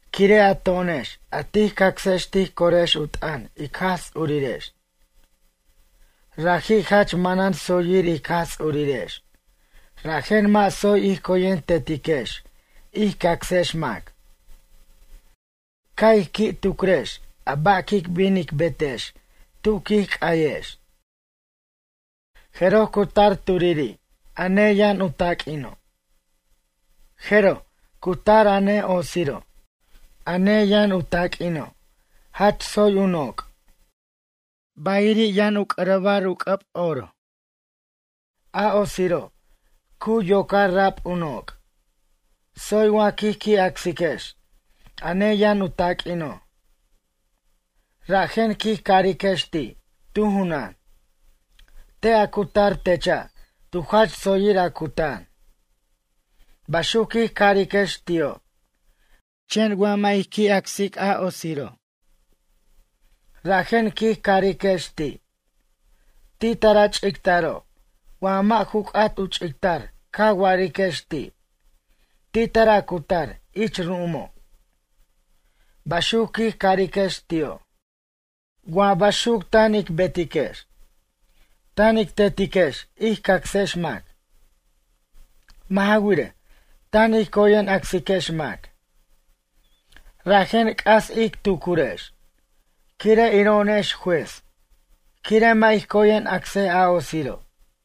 Quire' a to'onex a tij cacsex tij corex u t'ʌn ic Jaj Ts'urirex. Raji' jach manan tsoyir ic Jaj Ts'urirex rajen mʌ' tsoy ij coyen tetiquex ij cacsex mac. Ca' ic qui' tucrex a ba' quic bin ic betex tu quic c'ayex. Jeroj cu tar turiri' a neyʌn u taq'uino'. Jeroj cu tar a ne'otsiro'. A neyʌn u taq'uino' jach tsoy u noc'. Bayiri' yʌn u c'arabar u c'ʌb oro. A otsiro', cu yocar rab u noc'. Tsoy wa quij qui' acsiquex a neyʌn u taq'uino'. Rajen quij cariquex ti' tu junan: “Te' a cutar techa' tu jach tsoyir a cutan.” Baxuc quij cariquex ti'o'. Chen wa mʌ' ij qui' acsic a otsiro'. Rajen quij cariquex ti': “Ti' tar a ch'ictaro' wa mʌ' ju c'at u ch'ictar ca wa'ariquex ti' “Ti' tar a cutar ich ru'umo'.” Baxuc quij cariquex ti'o'.” Wa baxuc tan ic betiquex. Tan ic tetiquex ij cacsex mac. Mʌ' ja wirej, tan ij coyen acsiquex mac. Rajen c'as ic tucurex, quire' iro'onex juez, quire' mʌ' ij coyen acsej a otsiro'.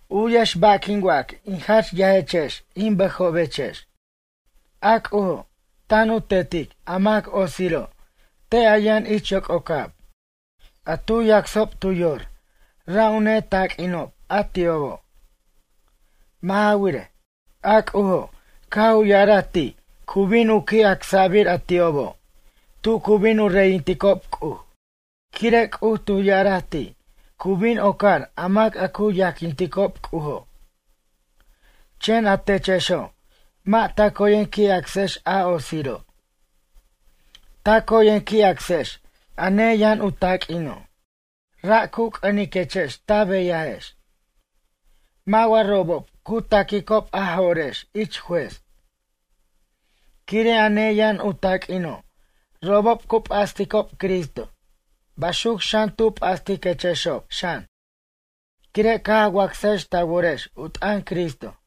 U'yex ba' quin wac in jach yajechex in bʌjobechex. A C'ujo' tan u tetic a mac otsiro' te' a yʌn ich yoc'ocab. A tu yacsob tu yor ra' u netaq'uinob a ti'obo'. Mʌ' ja wirej, a C'ujo' caj u ya'araj ti' cu bin u qui' acsʌbir a ti'obo' tu cu bin u reyintic C'uj. Quire' C'uj tu ya'araj ti' cu bin ocar a mac a cu yajquinticob C'ujo'. Chen atechexo', mʌ' ta coyen qui' acsex a otsiro'. Ta coyen qui' acsex a neyʌn u taq'uino'. Ra' cu c'ʌniquechex ta beyajex. Mʌ' wa robob cu ta'quicob a jo'rex ich juez? Quire' a neyʌn u taq'uino' robob cu p'asticob Cristo, baxuc xan tu p'astiquechexob xan quire' caj a wacsajex ta worex u t'ʌn Cristo.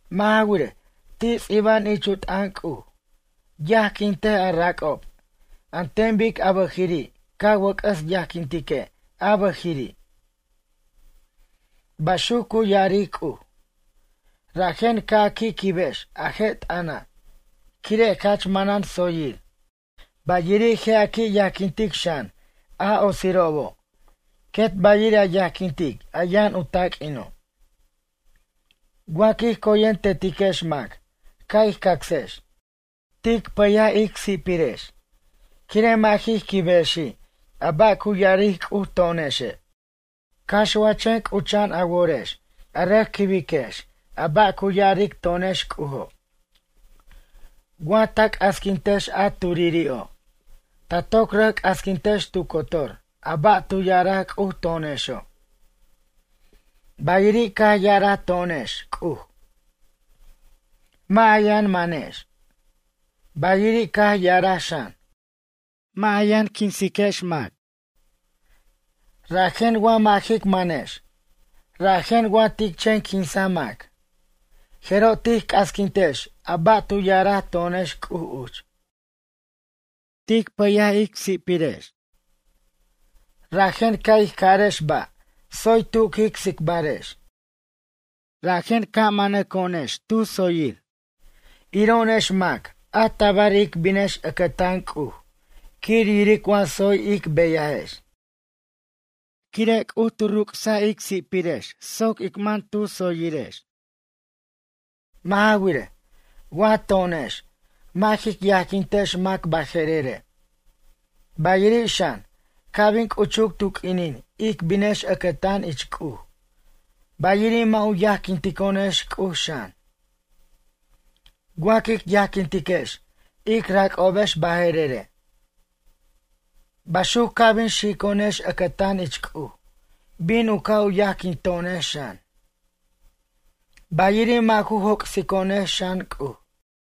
Mʌ' ja wirej, ti' ts'iba'an ich u t'ʌn C'uj: “Yajquintej a rac'ob an ten bic a bʌjiri' ca wʌc'ʌs yajquintique' a bʌjiri'.” Baxuc cu ya'aric C'uj. Rajen ca' a qui' quibiquex a je' t'ʌna', quire' jach manan tsoyir. Bayiri' je' a qui' yajquintic xan a otsirobo' quet bayiri' a yajquintic a yʌn u taq'uino'. Wa quij coyen tetiquex mac ca' ij cacsex. Tic pʌyej ic si'pirex quire' mʌ' jij quibexi' a ba' cu ya'aric C'uj to'onexe'. Cax wa chen c'ucha'an a worex a rʌc quibex a ba' cu ya'aric to'onex C'ujo'. Wa ta c'asquintex a turiri'o', ta toc rʌc c'asquintex tu cotor a ba' tu ya'araj C'uj to'onexo'. Bayiri' caj ya'araj to'onex C'uj: “Mʌ' a yʌn manex.” Bayiri' caj ya'araj xan: “Mʌ' a yʌn quinsiquechex mac.” Rajen wa mʌ' jic manex rajen wa tic chen quinsaj mac, jero' tij c'asquintex a ba' tu ya'araj to'onex C'uj uch. Tic pʌy ic si'pirex. Rajen ca' ij carex ba' tsoy tu quic tsicbarex. Rajen ca' ic manaco'onex tu tsoyir iro'onex mac a tabar ic binex ʌcʌtan C'uj quir yiric wa tsoy ic beyajex. Quire' C'uj tu ruc's ic si'pirex soc ic man tu tsoyirex. Mʌ' ja wirej, wa to'onex mʌ' jic yajquintex mac baje'rere'. Bayiri' xan ca' bin c'uchuc tu q'uinin ic binex ʌcʌtan ich C'uj, bayiri' mʌ' u yajquinto'onex C'uj xan. Wa quic yajquintiquex ic rac'obex baje'rere'. Baxuc ca' bin xico'onex ʌcʌtan ich C'uj bin u ca' u yajquinto'onex xan. Bayiri' mʌ' ju joc'sico'onex xan C'uj.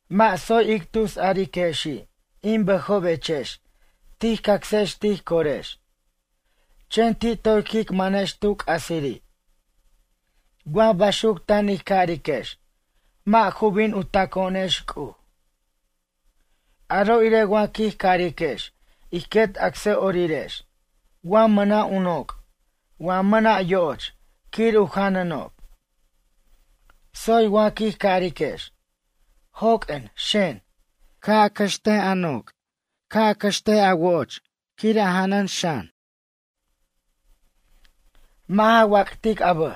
Mʌ' tsoy ic tusariquexi' in bʌjobechex tij cacsex tij corex, chen ti' toy quic manex tu c'asiri'. Wa baxuc tan ij cariquex mʌ' ju bin u taco'onex C'uj. Aro' irej wa quij cariquex ij quet acsʌ'orirex wa mʌna' u noc' wa mʌna' yo'och quir u janʌnob. Tsoy wa quij cariquex: “Joq'uen xen, ca' a cʌxt a noc', ca' a cʌxt a wo'och quir a janʌn xan. Mʌ' ja wac'tic a bʌj.”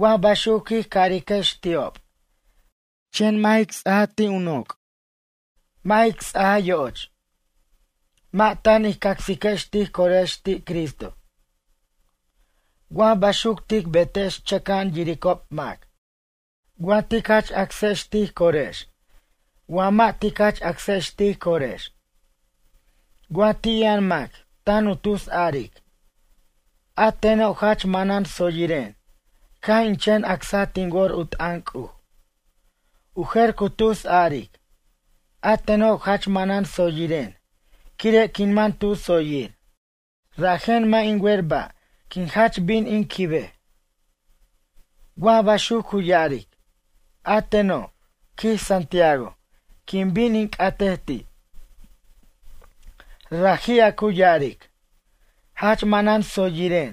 Wa baxuc quij cariquex ti'ob chen mʌ' jic ts'aj a ti' u noc' mʌ' jic ts'aja yo'och. Mʌ' tan ij cacsiquex tij corex ti' Cristo. Wa baxuc tic betex chaca'an yiricob mac, wa tic jach acsex tij corex wa mʌ' tic jach acsex tij corex. Wa ti' yʌn mac tan u tus aric: “A teno' jach manan tsoyiren caj in chen acsa tin wor u t'ʌn C'uj.” U jer cu tus aric: “A teno' jach manan tsoyiren quire' quin man tu tsoyir. Rajen mʌ' in wer ba' quin jach bin in quibej.” Wa baxuc cu ya'aric: A teno', quij Santiago, quin bin in c'atej ti'. Raji' a cu ya'aric: “Jach manan tsoyiren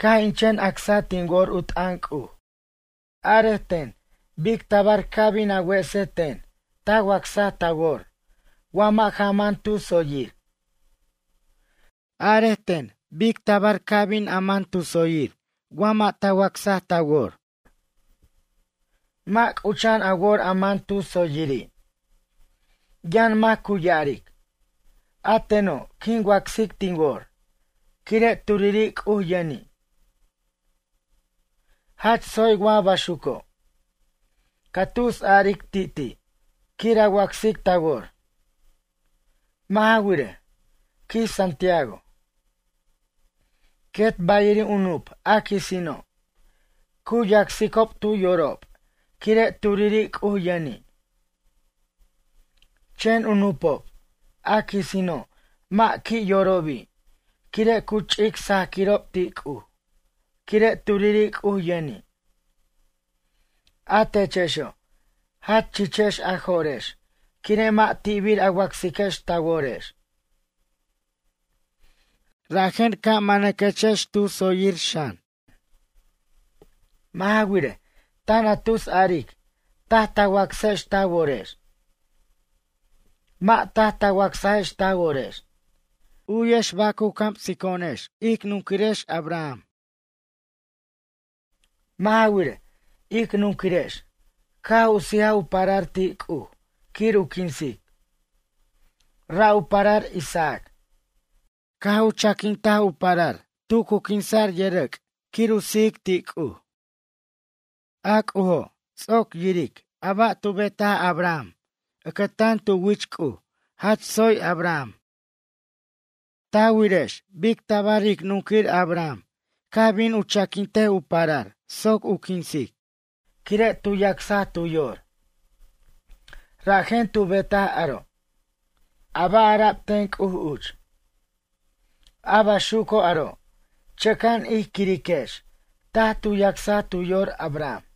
caj in chen acsa tin wor u t'ʌn C'uj.” Arej ten bic tabar ca bin a wese ten ta wacsaj ta wor wa mʌ' ja man tu tsoyir? Arej ten bic tabar ca bin man tu tsoyir wa mʌ' ta wacsaj ta wor? Mʌ' c'ucha'an a wor a man tu tsoyiri'. Yʌn mac cu ya'aric: “A teno' quin wacsic tin wor quire' turiri' C'uj yʌni'”, jach tsoy wa baxuco'. Ca tusaric ti'ti' quir a wacsic ta wor. Mʌ' ja wirej, quij Santiago. Quet bayiri' u nup' a quisino'. Cu yacsicob tu yorob quire' turiri' C'uj yʌni'. Chen u nup'ob, a quisino' mʌ' qui' yorobi' quire' cu ch'ic sajaquirob ti' C'uj quire' turiri' C'uj yʌni'. A techexo', jach chichex a jo'rex quire' mʌ' ti'bir a wacsiquex ta worex. Rajen ca' manaquechex tu tsoyir xan. Mʌ' ja wirej, tan a tusaric taj ta wacsex ta worex. Mʌ' taj ta wacsajex ta worex. U'yex ba' cu camsico'onex ic nunquirex Abram. Mʌ' ja wirej, ic nunquirex caj u sijaj u parar ti' C'uj quir u quinsic. Ra' u parar Isaac. Caj u chaquint u parar tu cu quinsa'r yʌrʌc' quir u sijic ti' C'uj. A C'ujo' ts'oc yiric a ba' tu betaj Abram, ʌcʌtan tu wich C'uj jach tsoy Abram. Ta wirex bic tabar ic nunquir Abram caj bin u chaquint u parar soc u quinsic quire' tu yacsaj tu yor, rajen tu betaj aro', a ba' ara'b ten C'uj uch. A baxuco' aro' chʌca'an ij quiriquex taj tu yacsaj tu yor Abram.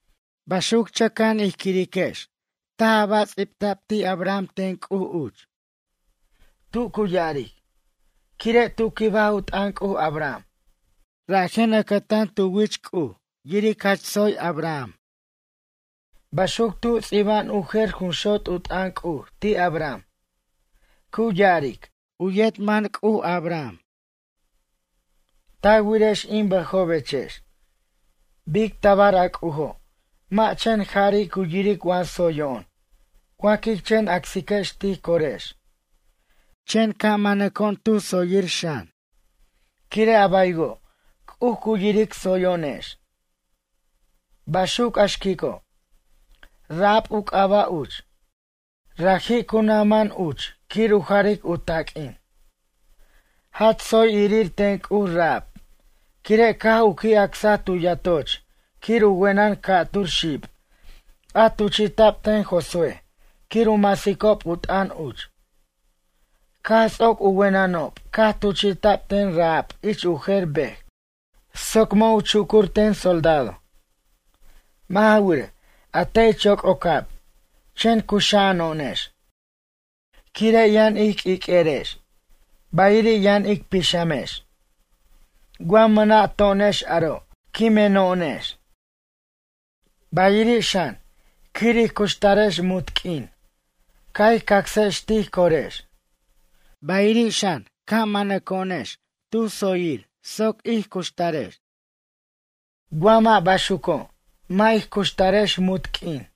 Baxuc chʌca'an ij quiriquex taj a ba' ts'ibta'b ti' Abram ten C'uj uch. Tu cu ya'aric: “Quire' tu quibaj u t'ʌn C'uj Abram rajen ʌcʌtan tu wich C'uj yiric jach tsoy Abram.” Baxuc tu ts'iba'an u jer jun xot' u t'ʌn C'uj ti' Abram. Cu ya'aric: “U yet man C'uj Abram.” Ta wirex in bʌjobechex. Bic tabar a C'ujo' mʌ' chen jari' cu yiric wa tsoyo'on wa quic chen acsiquex tij corex chen ca' manaco'on tu tsoyir xan quire' a baywo' C'uj cu yiric tsoyo'onex. Baxuc, a xquico' Rahab u c'aba' uch. Raji' cu naj man uch quir u jaric u taq'uin. Jach tsoy irir ten C'uj Rahab quire' caj u qui' acsa tu yatoch quir u wenʌn ca'tur xib a tuchi'ta'b ten Josué quir u masicob u t'ʌn uch. Caj ts'oc u wenʌnob caj tuchi'ta'b ten Rahab ich u jer bej soc mʌ' u chucur ten soldado. Mʌ' ja wirej, a te' ich yoc'ocab chen cuxa'ano'onex quire' yʌn ij q'uiq'uerex bayiri' yʌn ic pixamex. Wa mʌna' to'onex aro' quimeno'onex. Bayiri' xan quir ij cuxtarex munt q'uin ca' ij cacsex tij corex. Bayiri' xan ca' manaco'onex tu tsoyir soc ic cuxtarex. Wa mʌ' baxuco', mʌ' ij cuxtarex munt q'uin.